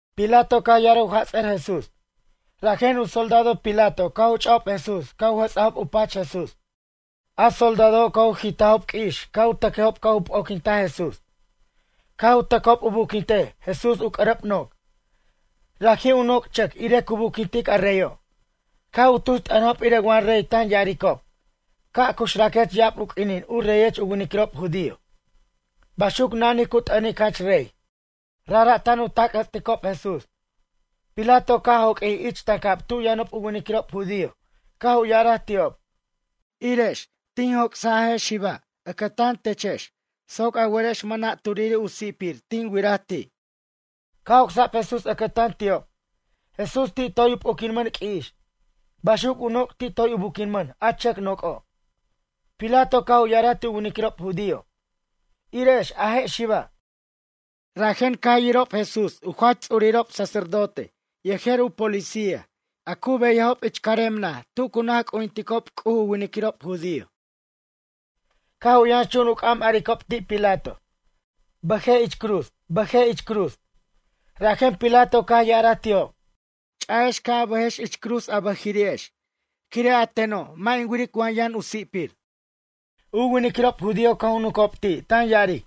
Pilato caj ya'araj u jats'ʌr Jesús. Rajen u soldado Pilato caj u ch'ajob Jesús caj u jʌts'ajob u pach Jesús. A soldadojo' caj u jit'ajob q'ui'ix caj u tʌcʌjob caj u p'o'quintaj Jesús. Caj u tʌcob u buquintej Jesús u c'ʌrʌb noc'. Raji' u noc' chʌc irej cu buquintic a reyo'. Caj u tus t'ʌnajob irej wa rey tan ya'aricob: ―Ca' cuxraquech ya'ab u q'uinin u reyech u winiquirob judío ―baxuc nanij cu t'anic jach rey. Rajra' tan u tac' jʌts'ticob Jesús. Pilato caj ca' joq'uij ich tancab tu' yʌnob u winiquirob judío caj u ya'araj ti'ob: ―Irex, tin joc'saj a je' xiba' ʌcʌtan techex soc a werex mʌna' turiri' u si'pir tin wiraj ti'. Caj joc'sab Jesús ʌcʌtan ti'ob. Jesús ti' toy u p'o'quinmʌn q'ui'ix. Baxuc u noc' ti' toy u buquinmʌn a chʌc noc'o'. Pilato caj u ya'araj ti' u winiquirob judío: ―Ire'ex a je' xiba'. Rajen caj yirob Jesús u jach ts'urirob sacerdote yejer u policía a cu beyajob ich carem naj tu cu naj c'ujinticob u winiquirob judío. Caj u yʌnxchun u c'am aricob ti' Pilato: ―Bʌjej ich cruz, bʌjej ich cruz. Rajen Pilato caj ya'araj ti'ob: ―Ch'a'ex ca' a bʌjex ich cruz a bʌjiri'ex quire' a teno' mʌ' in wiric wa yʌn u si'pir. U winiquirob judío caj u nuncob ti' tan ya'aric: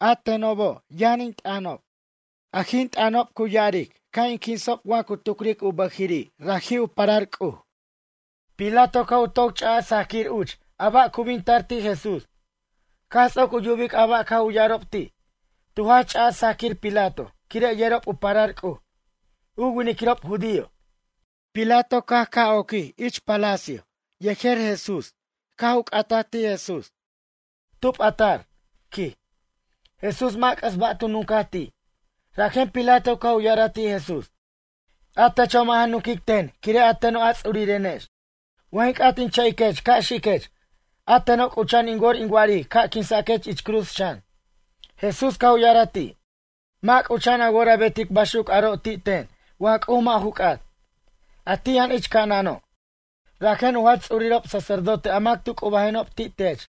―A tenob yʌn in t'ʌnob. Aj in t'ʌnob cu ya'aric ca' in quinsob wa cu tucric u bʌjiri' raji' u parar C'uj. Pilato caj u toc ch'aj sajquir uch a ba' cu bin tar ti' Jesús. Caj ts'oc u yubic a ba' caj u ya'arob ti', tu jach ch'aj sajaquir Pilato quire' yerob u parar C'uj, u winiquirob judío. Pilato caj ca' oquij ich palacio yejer Jesús caj u c'ataj ti' Jesús: ―Tub a tar? ―quij. Jesús mʌ' c'ʌs ba' tu nuncaj ti'. Rajen Pilato caj u ya'araj ti' Jesús: ―A techo' mʌ' ja nunquic ten quire' a teno' a ts'urirenex. Wa jin c'at in cha'iquech ca' xiquech. A teno' c'ucha'an in wor in wa'aric ca' in quinsech ich cruz xan. Jesús caj u ya'araj ti': ―Mʌ' c'ucha'an a wor a betic baxuc aro' ti' ten wa C'uj mʌ' ju c'at, a ti' yʌn ich ca'anano'. Rajen u jach ts'urirob sacerdote a mac tu c'ubajenob ti' tech,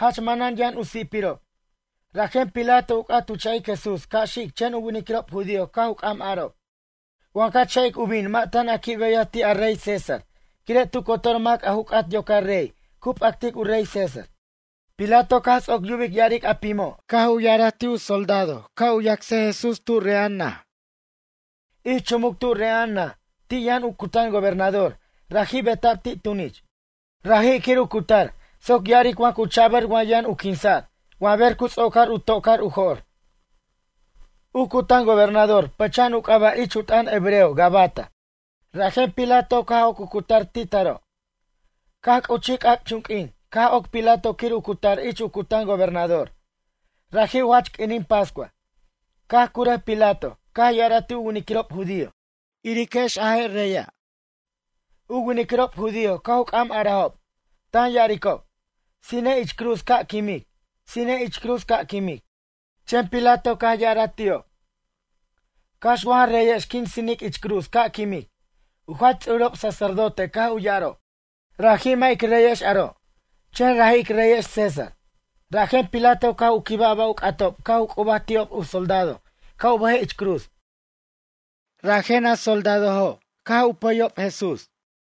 jach manan yʌn u si'pirob. Rajen Pilato u c'at u cha'ic Jesús ca' xic chen u winiquirob judío caj u c'am arob: ―Wa ca cha'ic u bin mʌ' tan a qui' beyaj ti' a rey César quire' tu cotor mac a ju c'at yocar rey cu p'actic u rey César. Pilato caj ts'oc yubic ya'aric a pimo' caj u ya'araj ti' u soldado ca' u yacsej Jesús tu re'a'an naj. Ich chumuc tu' re'a'an naj ti' yʌn u cutan gobernador raji' beta'b ti' tunich. Raji' quir u cutar soc ya'aric wa cu cha'bʌr wa yʌn u quinsa'r wa ber cu ts'ocar u to'car u jo'r. U cutan gobernador pʌcha'an u c'aba' ich u t'ʌn hebreo Gabata. Rajen Pilato caj oc u cutar ti' taro'. Caj c'uchij c'ac'chunq'uin caj oc Pilato quir u cutar ich u cutan gobernador. Raji' u jach q'uinin pascua. Caj curʌj Pilato caj ya'araj ti' u winiquirob judío: ―Iriquex a je' reyexa'. U winiquirob judío caj u c'am arajob, tan ya'aricob: ―Sinej ich cruz ca' quimic. Sinej ich cruz ca' quimic. Chen Pilato caj ya'araj ti'ob: ―Cax wa ja reyex quin sinic ich cruz ca' quimic? U jach ts'urirob sacerdote caj u ya'arob: ―Raji' mʌ' ic reyex aro'. Chen raji' ic reyex César. Rajen Pilato caj u quibaj a ba' u c'atob caj u c'ubaj ti'ob u soldado ca' u bʌjej ich cruz. Rajen a soldadojo' caj u pʌyob Jesús.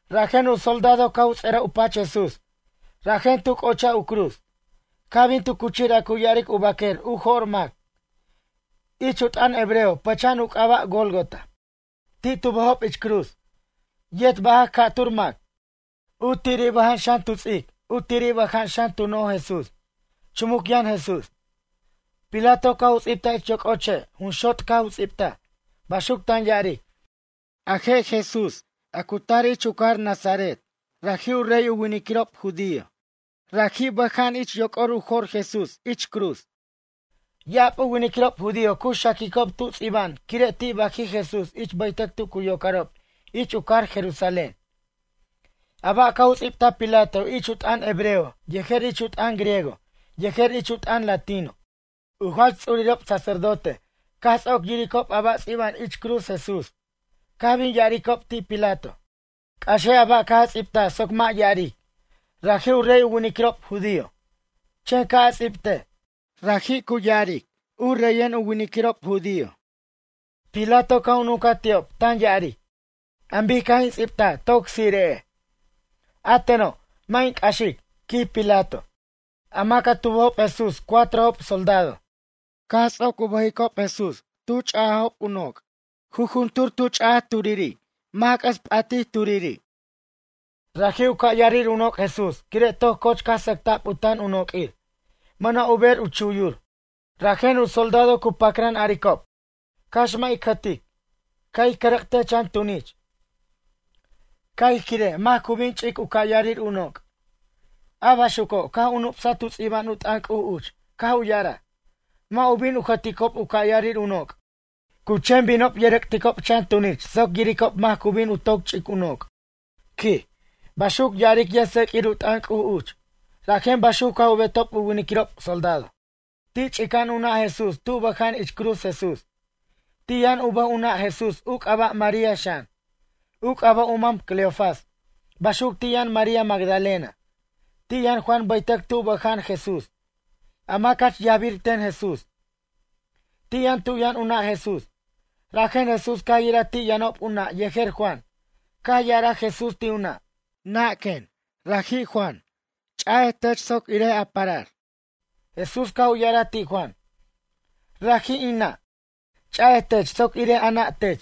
Rajen u soldado caj u ts'ʌraj u pach Jesús, rajen tu c'ochaj u cruz. Caj bin tu cuchir a cu ya'aric u baquer u jo'r mac. Ich u t'ʌn hebreo pʌcha'an u c'aba' Gólgota. Ti' tu bʌjob ich cruz, yet bajac ca'tur mac, u tiri' bʌja'an xan tu ts'ic, u tiri' bʌja'an xan tu no'oj Jesús. Chumuc yʌn Jesús. Pilato caj u ts'ibtaj ich yoc'o che' jun xot' caj u ts'ibta, baxuc tan ya'aric: “A je' Jesús a cu tar ich u cajar Nazaret, raji' u rey u winiquirob judío.” Raji' bʌja'an ich yoc'or u jo'r Jesús ich u cruz. Ya'ab u winiquirob judío cu xaquicob tu' ts'iba'an quire' ti' bajij Jesús ich bʌytʌc tu cu yocarob ich u cajar Jerusalén. A ba' caj u ts'ibtaj Pilato ich u t'ʌn hebreo yejer ich u t'ʌn griego yejer ich u t'ʌn latino. U jach ts'urirob sacerdote caj ts'oc yiricob a ba' ts'iba'an ich cruz Jesús caj bin ya'aricob ti' Pilato: ―C'axej a ba' caj a ts'ibtaj soc mʌ' ya'aric: “Raji' u rey u winiquirob judío.” Chen ca' a ts'ibtej: “Raji' cu ya'aric u reyen u winiquirob judío.” Pilato caj u nuncaj ti'ob tan ya'aric: ―An bic caj in ts'ibtaj toc tsire'ej, a teno', mʌ' in c'axic ―quij Pilato. A mac a tu bʌjob Jesús cuatrojob soldado. Caj ts'oc u bʌjicob Jesús tu ch'ajob u noc'. Jujuntur tu ch'aj turiri', c'ʌs p'atij turiri'. Raji' u ca' yarir u noc' Jesús quire' toc coch caj sʌcta'b u tan u noq'uir, mʌna' u ber u chuyur. Rajen u soldado cu pacran aricob: ―Cax mʌ' ic jʌtic. Ca' ij cʌrʌc'tej chan tunich, ca' ij quirej mac cu bin ch'ic u ca' yarir u noc'. A baxuco' caj u nup'saj tu' ts'iba'an u t'ʌn C'uj uch caj u ya'araj: “Mʌ' u bin u jʌticob u ca' yarir in noc'. Cu chen binob yʌrʌc'ticob chan tunich soc yiricob mac cu bin u toc ch'ic in noc'”, quij. Baxuc ya'aric yʌjtseq'uir u t'ʌn C'uj uch. Rajen baxuc caj u betob u winiquirob soldado. Ti' ch'ica'an u nʌ' Jesús tu' bʌja'an ich cruz Jesús. Ti' yʌn u bʌj u nʌ' Jesús u c'aba' María xan. U c'aba' u mam Cleofas. Baxuc ti' yʌn María Magdalena. Ti' yʌn Juan bʌytʌc tu' bʌja'an Jesús, a mac jach yajbir ten Jesús. Ti' yʌn tu' yʌn u nʌ' Jesús. Rajen Jesús caj yiraj ti' yʌnob u nʌ' yejer Juan, caj ya'araj Jesús ti' u nʌ': ―Nʌ', quen, raji' Juan, ch'a'ej tech soc irej a parar. Jesús caj u ya'araj ti' Juan: ―Raji' in nʌ', ch'a'ej tech soc irej a nʌ' tech.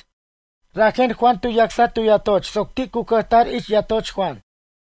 Rajen Juan tu yacsaj tu yatoch soc ti' cu cʌjtar ich yatoch Juan.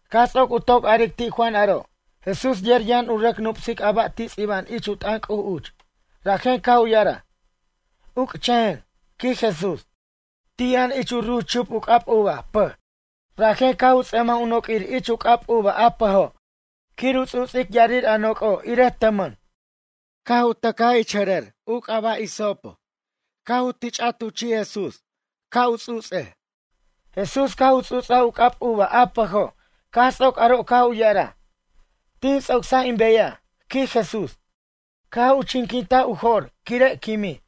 Caj ts'oc u toc aric ti' Juan aro', Jesús yer yʌn u rʌc nup'sic a ba' ts'iba'an ich u t'ʌn C'uj uch, rajen caj u ya'araj: ―Uc'chʌjen ―quij Jesús. Ti' yʌn ich ruch chup u c'ab uva, pʌj. Rajen caj u ts'ʌmaj u noq'uir ich u c'ab uva a pʌjo' quir u ts'u'ts'ic ya'arir a noc'o' irej tʌmʌn. Caj u tʌcaj ich jʌrʌr u c'aba' hisopo caj u tich'itej u chi' Jesús ca' u ts'u'ts'aj. Jesús caj u ts'u'ts'aj u c'ab uva a pʌjo' caj ts'oc aro' caj u ya'araj: ―Tin ts'ocsaj in beyaj ―quij Jesús. Caj u chinquintaj u jo'r quire' quimij.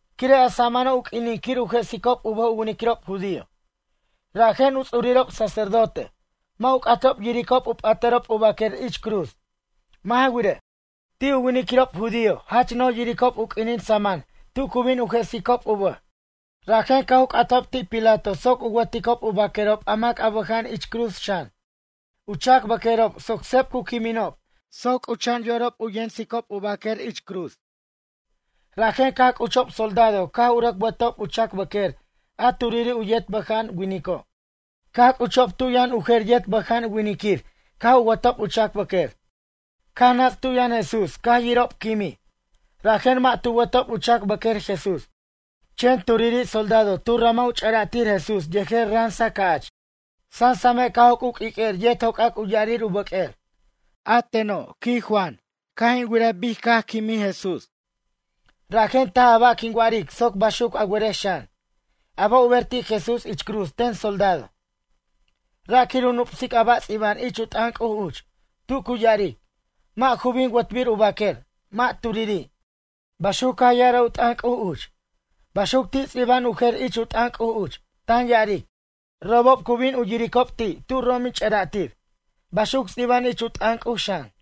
Quire' a samano' u q'uinin quir u jesicob u bʌj u winiquirob judío, rajen u ts'urirob sacerdote. Mʌ' u c'atob yiricob u p'atʌrob u baquer ich cruz. Mʌ' ja wirej, ti' u winiquirob judío jach no'j yiricob u q'uinin saman tu cu bin u jesicob u bʌj. Rajen caj u c'atajob ti' Pilato soc u wʌticob u baquerob a mac a bʌja'anob ich cruz xan, u chac bʌq'uerob soc seb cu quiminob soc c'ucha'an yorob u yemsicob u baquer ich cruz. Rajen caj c'uchob soldado caj u rʌc wʌtob u chac bʌq'uer a turiri' u yet bʌja'an winico'. Caj c'uchob tu' yʌn u jer yet bʌja'an winiquir caj u wʌtob u chac bʌq'uer. Caj nats' tu' yʌn Jesús caj yirob quimij, rajen mʌ' tu wʌtob u chac bʌq'uer Jesús. Chen turiri' soldado tu ramaj u ch'ara'tir Jesús yejer ransa ca'ch. Sasame' caj joc' u q'uiq'uer yet jocac u ya'arir u bʌq'uer. A teno', quij Juan, caj in wiraj bic caj quimij Jesús. Rajen taj a ba' quin wa'aric soc baxuc a werex xan. A ba' u ber ti' Jesús ich cruz ten soldado, ra' quir u nup'sic a ba' ts'iba'an ich u t'ʌn C'uj uch, tu cu ya'aric: “Mʌ' ju bin wʌtbir u baquer, mʌ' turiri'”, baxuc caj ya'araj u t'ʌn C'uj uch. Baxuc ti' ts'iba'an u jer ich u t'ʌn C'uj uch, tan ya'aric: “Robob cu bin u yiricob ti' tu' rom in ch'ʌra'tir”, baxuc ts'iba'an ich u t'ʌn C'uj xan.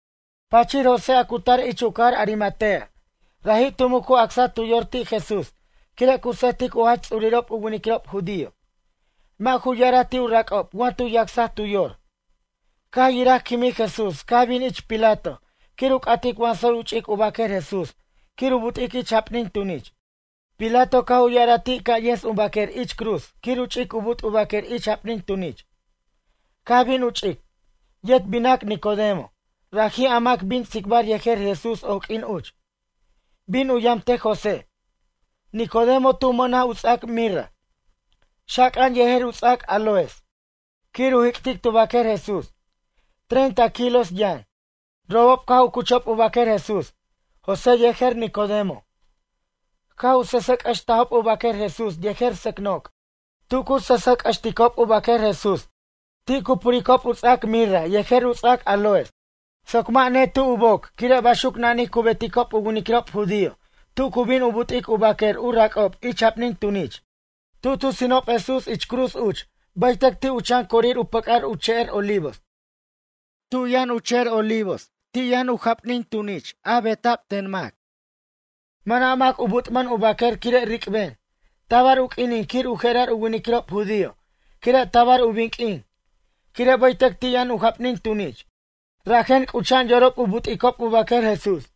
Pachir José a cu tar ich u cajar Arimatea, raji' tu muc u acsaj tu yor ti' Jesús quire' cu sʌjtic u jach ts'urirob u winiquirob judío, mʌ' ju ya'araj ti' u rac'ob wa tu yacsaj tu yor. Caj yiraj quimij Jesús caj bin ich Pilato quir u c'atic wa tsoy u ch'ic u baquer Jesús quir u but'ic ich japnin tunich. Pilato caj u ya'araj ti' ca' yens u baquer ich cruz quir u ch'ic u but' u baquer ich japnin tunich. Caj bin u ch'ic. Yet binac Nicodemo, raji' a mac bin tsicbar yejer Jesús oq'uin uch. Bin u yamtej José. Nicodemo tu mʌnaj u ts'ac mirra, xaca'an yejer u ts'ac áloes quir u jic'tic tu bʌq'uer Jesús, treinta kilos yʌn. Robob caj u cuchob u baquer Jesús, José yejer Nicodemo. Caj u sʌsʌjc'ʌstajob u baquer Jesús yejer sʌc noc'. Tu cu sʌsʌjc'ʌsticob u baquer Jesús, ti' cu puricob u ts'ac mirra yejer u ts'ac áloes soc mʌ' netu' u boc quire' baxuc nanij cu beticob u winiquirob judío tu cu bin u but'ic u baquer u rac'ob ich japnin tunich. Tu' tu sinob Jesús ich cruz uch bʌytʌc ti' u chan corir u pʌc'ar u che'er Olivos. Tu' yʌn u che'er Olivos ti' yʌn u mucnaj japnin tunich a beta'b ten mac. Mʌna' mac u but'mʌn u baquer quire' ric'ben. Tabar u q'uinin quir u jerar u winiquirob judío quire' tabar u bin q'uin. Quire' bʌytʌc ti' yʌn u japnin tunich, rajen c'ucha'an yorob u but'icob u baquer Jesús.